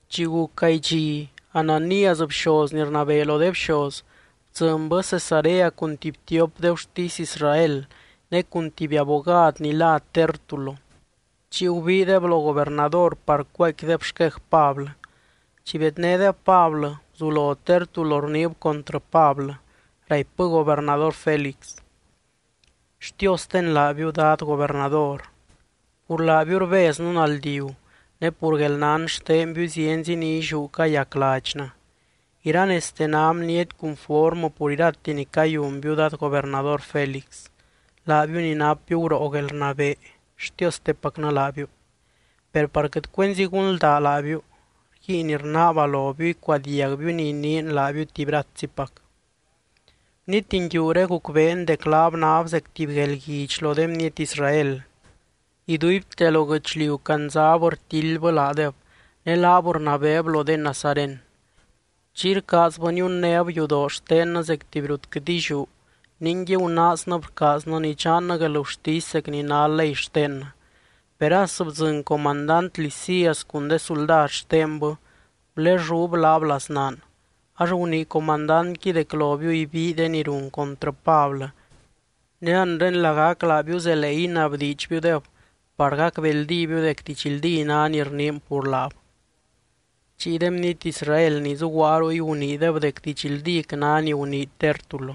Chi guc gaay dxi, Ananías, bxoz ni rnabee lo de bxoz, bdzɨnbɨ Cesarea cun tuby tiop de gurtisy Israel ne cun tuby abogad ni lá Tértulo. Chiy gubiideb lo gobernador par cuaaicquideb xquej Pablɨ. Chi bednédeb Pablɨ, guzulo Tértulo rniib contrɨ Pablɨ. Raipbɨ gobernador Félix: —Xtiosten laabiu, dad gobernador. Pur laabiu rbeznɨ naldiu, ne pur guelnán xtenbiu zienzi ni illiú cayac ladxnɨ. Iranezte ná bniety cunformɨ pur irate ni cayunbiu dad gobernador Félix, laabiu ni napbiu guroo guelrnabee, xtiostepacnɨ laabiu. Per par quɨt cuenzi gunldaa laabiu, rguiin rnaaba lobiu icuadiagbiu ni iniin laabiu tuby ratzipac. Bniety nguiuré gucbeen dec laab náb zec tuby guelguidx lo de bniety Israel, iduibte lo guɨchliu candzab rtildbɨ laadeb, ne laab rnabeeb lo de nazaren. Chiy rcaazbɨ niunnéb yudoroo xtennɨ zec tuby rut quɨt illiú, ningui gunaaznɨb rcaaznɨ nidxannɨ guelgurtisy zec ni ná ley xtennɨ. Per as bdzɨny comandant Lisias cun de suldad xtenbɨ, gulellúb laab laznaan. Ax gunii comandantqui dec lobiu ibii de ni run contrɨ Pablɨ. Ne anre lagac laabiu zelee inabdiidxbiudeb par gacbeldíbiu dec didxldí ná ni rniin pur laab. Chiy de bniety Israel ni zuguaa ruy guniideb dec didxldíc ná ni gunii Tértulo.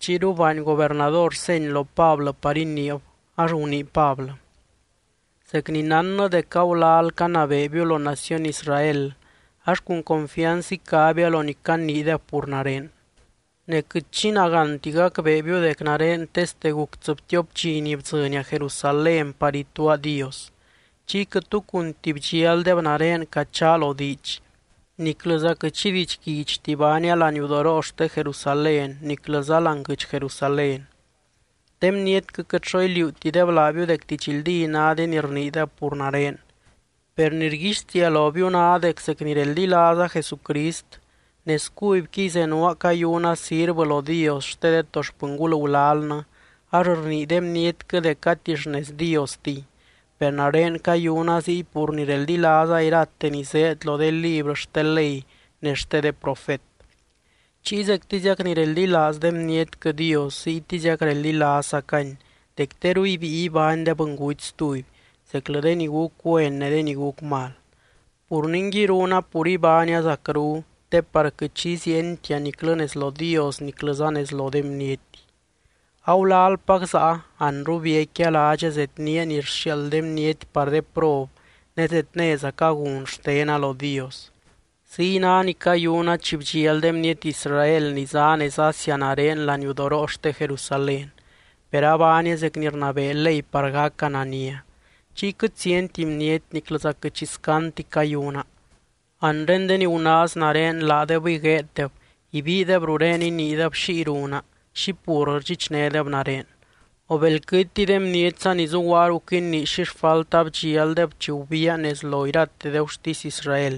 Chiyru baany gobernador seny lo Pablɨ par iniib, ax gunii Pablɨ: —Zec ni nánna dec agulal canabeebiu lo naciony Israel, ax cun confianz icabia lo ni caniideb pur nare. Ne quɨt xi nagánti gacbeebiu dec nare teste guc tsɨbtiop dxi ni bdzɨnia Jerusalén par ituaa Dios. Chiy quɨt tu cunti bdxialdeb nare cachaa lo diidx, niclɨza quɨt xi didxguidxti baania laniudoroo xte Jerusalén, niclɨza láani guɨdx Jerusalén. De bnietquɨ quɨt xo iliuutideb laabiu dec didxldí ná de ni rniideb pur nare. Per ni rguixtiia lobiu ná dec zec ni reldilaaza Jesucrist, nez cubyquiy zenuaa cayuna sirvɨ lo Dios xte de to xpɨngul gulalnɨ, ax rnii de bnietquɨ dec gati xnez Diostiy, per nare cayuna ziy pur ni reldilaaza irate ni zéed lo de librɨ xte ley ne xte de profet. Chiy zectiziac ni reldilaaz de bnietquɨ Dios, ziytiziac reldilaazzacany dec teru ibíi ibány de bɨnguty stuby, zeclɨ de ni guc güen ne de ni guc mal. Pur ningui, runa pur ibánia zacru te par quɨt xi iziientia niclɨ nez lo Dios niclɨza nez lo de bniety. ’Agulalpac záa, anru biecquia ládxa zednía ni rxiaald de bniety par de prob ne zednézaca gun xtena lo Dios. Ziy ná ni cayuna chi bdxial de bniety Israel ni zá nez Asia nare laniudoroo xte Jerusalén, per abaania zec ni rnabee ley par gaca nania. Chiy quɨt zienti bniety, niclɨza quɨt xi scandti cayuna. Anre de ni gunaaz nare laadebɨy gueeddeb, ibiideb rurén iniideb xiy runa, xi pur rdxichnédeb nare. O belquɨtiy, de bnietza ni zuguaa ruc inii xi xfalta bdxialdeb chi gubiia nez lo irate de gurtisy Israel.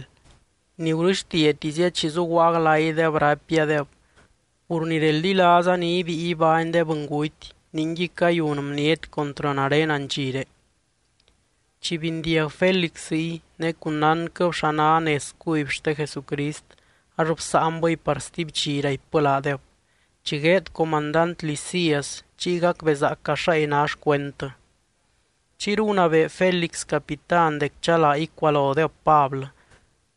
Ni gurɨxtiatizia chi zuguaa glaydeb, raipiadeb: “Pur ni reldilaaza ni ibíi ibány de bɨnguty, ningui cayun bniety contrɨ nare andxiré.” Chi bindiag Félix ziy, ne cun nánquɨb xa ná nez cuby xte Jesucrist ax bsáanbɨy par stuby dxi, raipbɨ laadeb: —Chi gueed comandant Lisias, chiy gacbezaaca xáy ná xcuendtɨ. Chiyru gunabee Félix capitán dec chalaa icualodeb Pablɨ,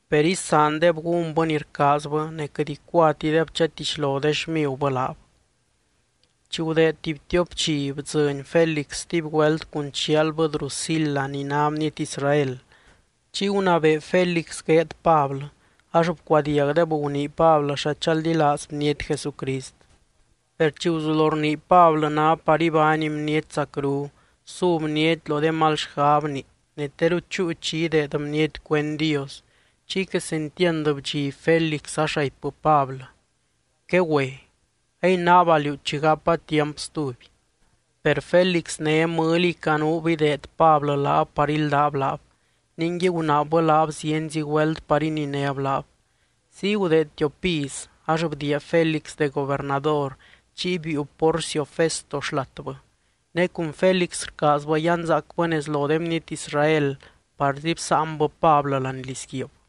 per isaandeb gúnbɨ ni rcaazbɨ ne quɨt icuatideb chatixlo de xmigubɨ laab. Chi gudeed tuby tiop dxi, bdzɨny Félix stuby güelt cun chialbɨ Drusila ni ná bniety Israel. Chiy gunabee Félix gueed Pablɨ, ax bcuadiagdeb gunii Pablɨ xa chaldilaaz bniety Jesucrist. Per chi guzulo rnii Pablɨ ná par ibány bniety zacru, su bniety lo de mal xgabni ne teru chúu chi ideed bniety cuend Dios, chiy quesentiand bdxiby Félix ax raipbɨ Pablɨ: —Quegüe. A inaaba liú chi gapa tiamp stuby. Per Félix né mɨliy canuub ideed Pablɨ laab par íldab laab, ningui gunaabbɨ laab zienzi güelt par ininéb laab. Ziy gudeed tiop iz, ax bdiia Félix de gobernador chiy biiu Porcio Festo xlatbɨ. Ne cun Félix rcaazbɨ yanzaacbɨ nez lo de bniety Israel, parzi bsáanbɨ Pablɨ láani lizguiib.